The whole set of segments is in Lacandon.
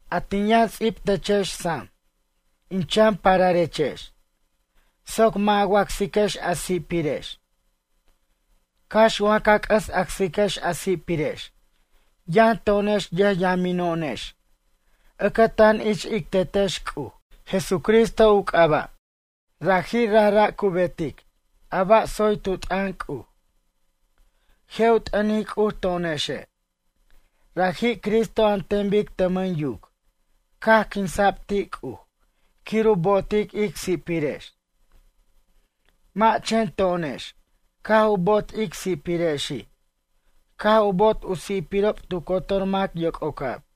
A tin yʌn ts'ib techex sam, in chan pararechex, soc mʌ' a wacsiquex a si'pirex. Cax wa ca c'ʌs acsiquex a si'pirex, yʌn to'onex yʌjyamino'onex ʌcatan ich ic Tetex C'uj, Jesucristo u c'aba'. Raji' rajra' cu betic a ba' tsoy tu t'ʌn C'uj. Je' u t'ʌnic C'uj to'onexe'. Raji' Cristo an ten bic tʌmʌn yuc caj quinsa'b ti' C'uj quir u bo'otic ic si'pirex. Mʌ' chen to'onex caj u bo'ot ic si'pirexi', caj u bo'ot u si'pirob tu cotor mac yoc'ocab.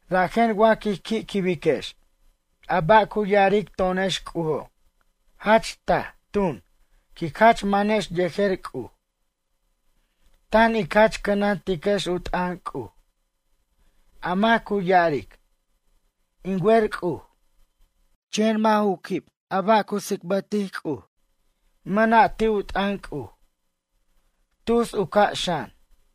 Rajen wa quij qui' quibiquex a ba' cu ya'aric to'onex C'ujo', jach taj, tun, quic jach manex yejer C'uj. Tan ic jach cʌnantiquex u t'ʌn C'uj. A mac cu ya'aric: “In wer C'uj.” Chen mʌ' ju quib a ba' cu tsicbʌtic C'uj, mʌna' ti' u t'ʌn C'uj. Tus u ca' xan.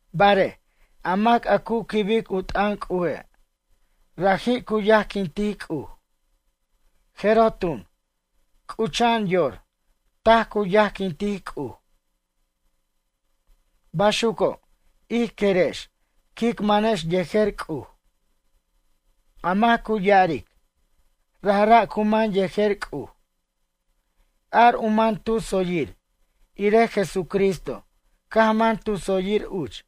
Barej, a mac a cu quibic u t'ʌn C'uje', raji' cu yajquintic C'uj. Jeroj tun, c'ucha'an yor, taj cu yajquintic C'uj. Baxuco', ij querex quic manex yejer C'uj. A mac cu ya'aric: “Rajra' cu man yejer C'uj.” Ar u man tu tsoyir irej Jesucristo caj man tu tsoyir uch.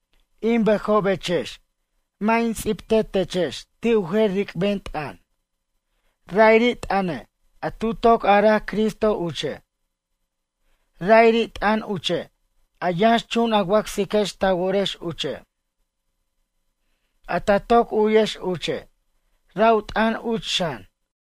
In bʌjobechex, mʌ' in ts'ibte techex ti' u jer ric'ben t'ʌn. Ra'iri' t'ʌne', a tu toc araj Cristo uche'. Ra'iri' t'ʌn uche' a yʌnxchun a wacsiquex ta worex uche'. A ta toc u'yex uche', ra' u t'ʌn uch xan.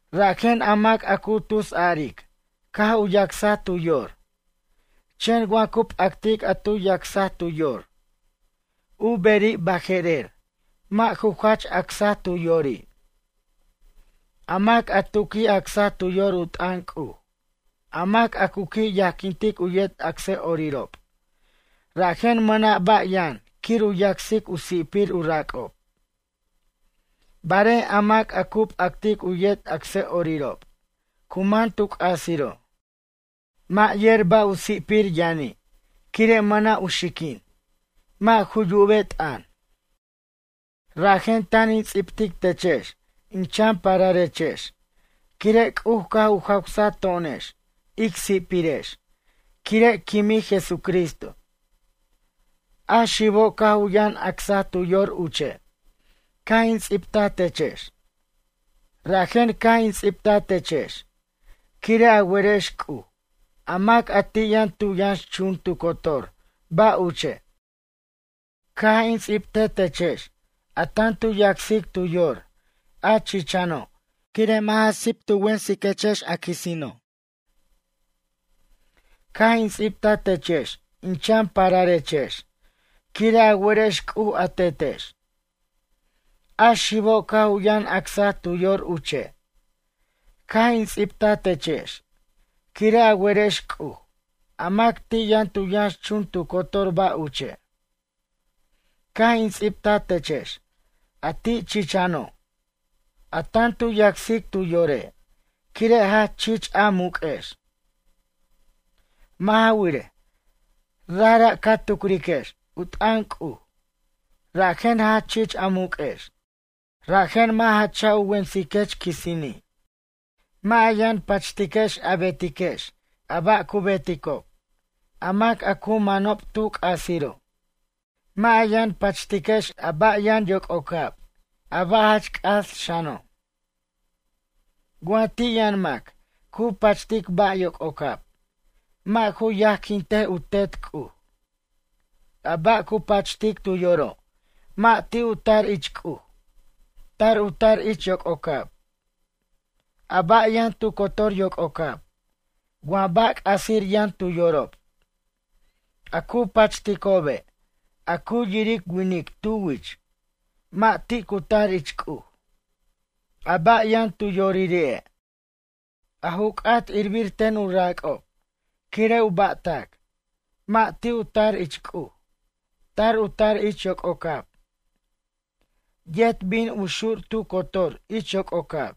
Rajen a mac a cu tusaric caj u yacsaj tu yor, chen wa cu p'actic a tu yacsaj tu yor, u beri' baje'rer mʌ' ju jach acsaj tu yori'. A mac a tu qui' acsaj tu yor u t'ʌn C'uj, a mac a cu qui' yajquintic u yet acsʌ'orirob, rajen mʌna' ba' yʌn quir u yacsic u si'pir u rac'ob. Barej a mac u p'actic u yet acsʌ'orirob cu man tu c'asiro'. Mʌ' yer ba' u si'pir yʌni' quire' mʌna' u xiquin, mʌ' ju yube t'ʌn. Rajen tan in ts'ibtic techex in chan pararechex quire' C'uj caj u jawsaj to'onex ic si'pirex quire' quimij Jesucristo. A xibo' caj u yʌn acsaj tu yor uche', caj in ts'ibta techex. Rajen caj in ts'ibta techex quire' a werex C'uj, a mac a ti' yʌn tu yʌnxchun tu cotor ba' uche'. Caj in ts'ibte techex a tan tu yacsic tu yor, a chichano' quire' mʌ' ja sip tu wensaquechex quisino'. Caj in ts'ibta techex in chan pararechex, quire' a werex C'uj a Tetex. A xibo' caj u yʌn acsaj tu yor uche', caj in ts'ibta techex quire' a werex C'uj, a mac ti' yʌn tu yʌnxchun tu cotor ba' uche'. Caj in ts'ibta techex ti' a chichano', a tan tu yacsic tu yore' quire' jach chich a muq'uex. Mʌ' ja wirej, rajra' ca tucriquex u t'ʌn C'uj, rajen jach chich a muq'uex. Rajen mʌ' ja cha' u wensiquex quisini'. Mʌ' a yʌn pachtiquechex a betiquex a ba' cu beticob, a mac a cu manob tu c'asiro'. Mʌ' a yʌn pachtiquechex a ba' yʌn yoc'ocab a ba' jach c'as xano'. Wa ti' yʌn mac cu pachtic ba' yoc'ocab, mʌ' ju yajquinte u Tet C'uj. A ba' cu pachtic tu yoro', mʌ' ti' u tar ich C'uj. Tar u tar ich yoc'ocab. A ba' yʌn tu cotor yoc'ocab, wa ba' c'asir yʌn tu yorob. A cu pachticobe', a cu yiric winic tu wich, mʌ' ti' cu tar ich C'uj. A ba' yʌn tu yoriri'e'. A ju c'at irbir ten u rac'ob quire' u ba'tac, mʌ' ti' u tar ich C'uj, tar u tar ich yoc'ocab. Yet bin u xur tu cotor ich yoc'ocab.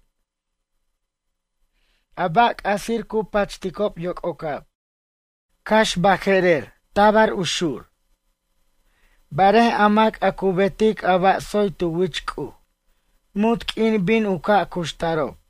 A ba' c'asir cu pachticob yoc'ocab. Cax baje'rer tabar u xur. Barej a mac cu betic a ba' tsoy tu wich C'uj, munt q'uin bin u ca' cuxtarob.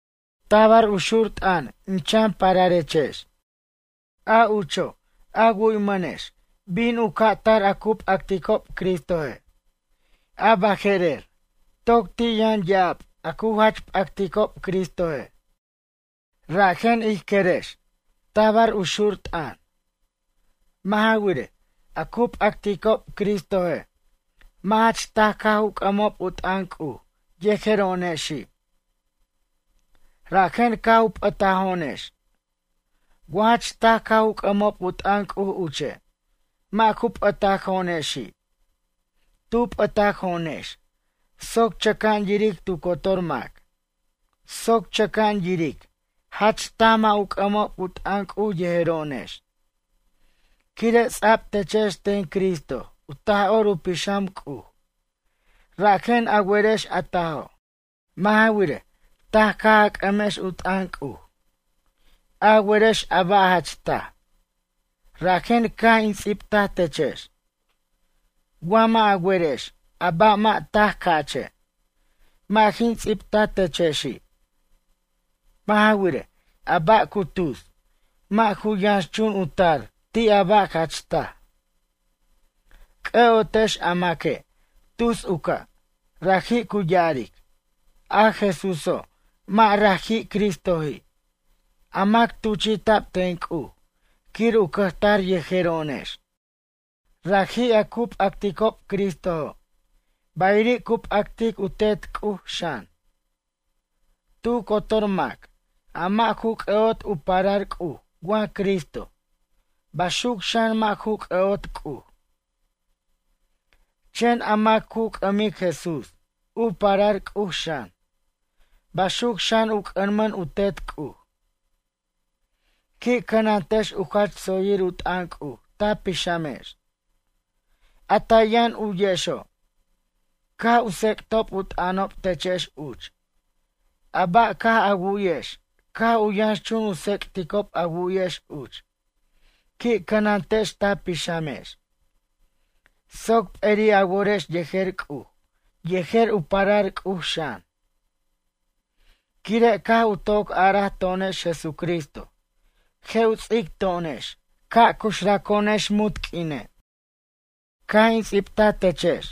Tabar u xur t'ʌn in chan pararechex. A ucho', a wu'yamʌnechex bin u ca' tar a cu p'acticob Cristoje'. A baje'rer, toc ti' yʌn ya'ab a cu jach p'acticob Cristoje'. Rajen ij querex tabar u xur t'ʌn. Mʌ' ja wirej, a cu p'acticob Cristoje', mʌ' jach taj caj u c'ʌmob u t'ʌn C'uj yejero'onexi'. Rajen caj u p'ʌtajo'onex. Wa jach taj caj u c'ʌmob u t'ʌn C'uj uche', mʌ' ju p'ʌtajo'onexi'. Tu p'ʌtajo'onex soc chʌca'an yiric tu cotor mac. Soc chʌca'an yiric jach taj mʌ' u c'ʌmob u t'ʌn C'uj yejero'onex. Quire' ts'a'b techex ten Cristo u Taj'or u Pixam C'uj rajen a werex a tajo'. Mʌ' ja wirej, taj caj a c'ʌmex u t'ʌn C'uj. A werex a ba' jach taj, rajen caj in ts'ibtaj techex. Wa mʌ' a werex a ba' mʌ' taj ca'che', mʌ' jin ts'ibta techexi'. Mʌ' ja wirej, a ba' cu tus, mʌ' ju yʌnxchun u tar ti' a ba' jach taj. C'ʌ'otex a maque' tus u ca', raji' cu ya'aric: “A Jesúso', mʌ' raji' Cristoji', a mac tuchi'ta'b ten C'uj quir u cʌjtar yejero'onex.” Raji' a cu p'acticob Cristojo', bayiri' cu p'actic u Tet C'uj, xan. Tu cotor mac a mʌ' ju c'ʌ'ot u parar C'uj wa Cristo, baxuc xan mʌ' ju c'ʌ'ot C'uj. Chen a mac cu c'ʌmic Jesús, u parar C'uj xan, baxuc xan u c'ʌmʌn u Tet C'uj. Qui' cʌnantex u jach tsoyir u t'ʌn C'uj ta pixamex. A ta yʌn u'yexo' caj u tsec'tob u t'ʌnob techex uch. A ba' caj a wu'yex caj u yʌnxchun u tsec'ticob a wu'yex uch, qui' cʌnantex ta pixamex. Soc p'eri' a worex yejer C'uj yejer u parar C'uj xan. Quire' caj u toc araj to'onex Jesucristo je' u ts'ic to'onex ca' cuxraco'onex munt q'uine'. Caj in ts'ibta techex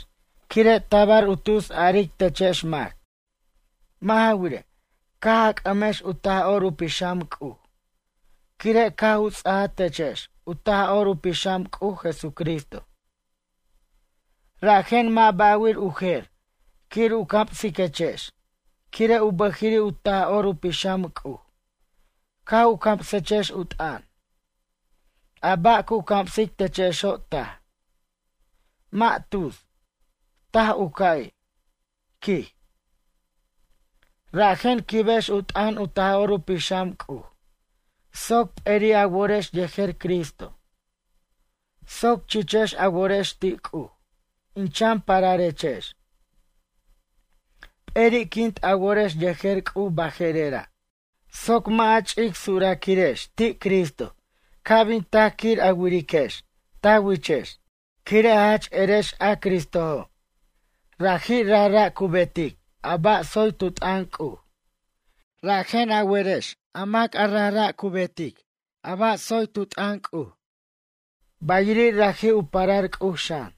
quire' tabar u tus aric techex mac. Mʌ' ja wirej, caj a c'ʌmex u Taj'or u Pixam C'uj, quire' caj u ts'aja techex u Taj'or u Pixam C'uj Jesucristo. Rajen mʌ' ba'wir u jer quir u camsiquechex, quire' u bʌjiri' u Taj'or u Pixam C'uj caj u camsechex u t'ʌn. A ba' cu camsic techexo' taj. Mʌ' tus, taj u ca'i', quij. Rajen quibex u t'ʌn u Taj'or u Pixam C'uj soc p'eri' a worex yejer Cristo. Soc chichex a worex ti' C'uj, in chan pararechex. P'eri'quint a worex yejer C'uj baje'rera', soc mʌ' a ch'ic suraquirex ti' Cristo ca' bin tac quir a wiriquex ta wichex. Quire' a jach erex a Cristojo', raji' rajra' cu betic a ba' tsoy tu t'ʌn C'uj. Rajen a werex a mac a rajra' cu betic a ba' tsoy tu t'ʌn C'uj, bayiri' raji' u parar C'uj xan.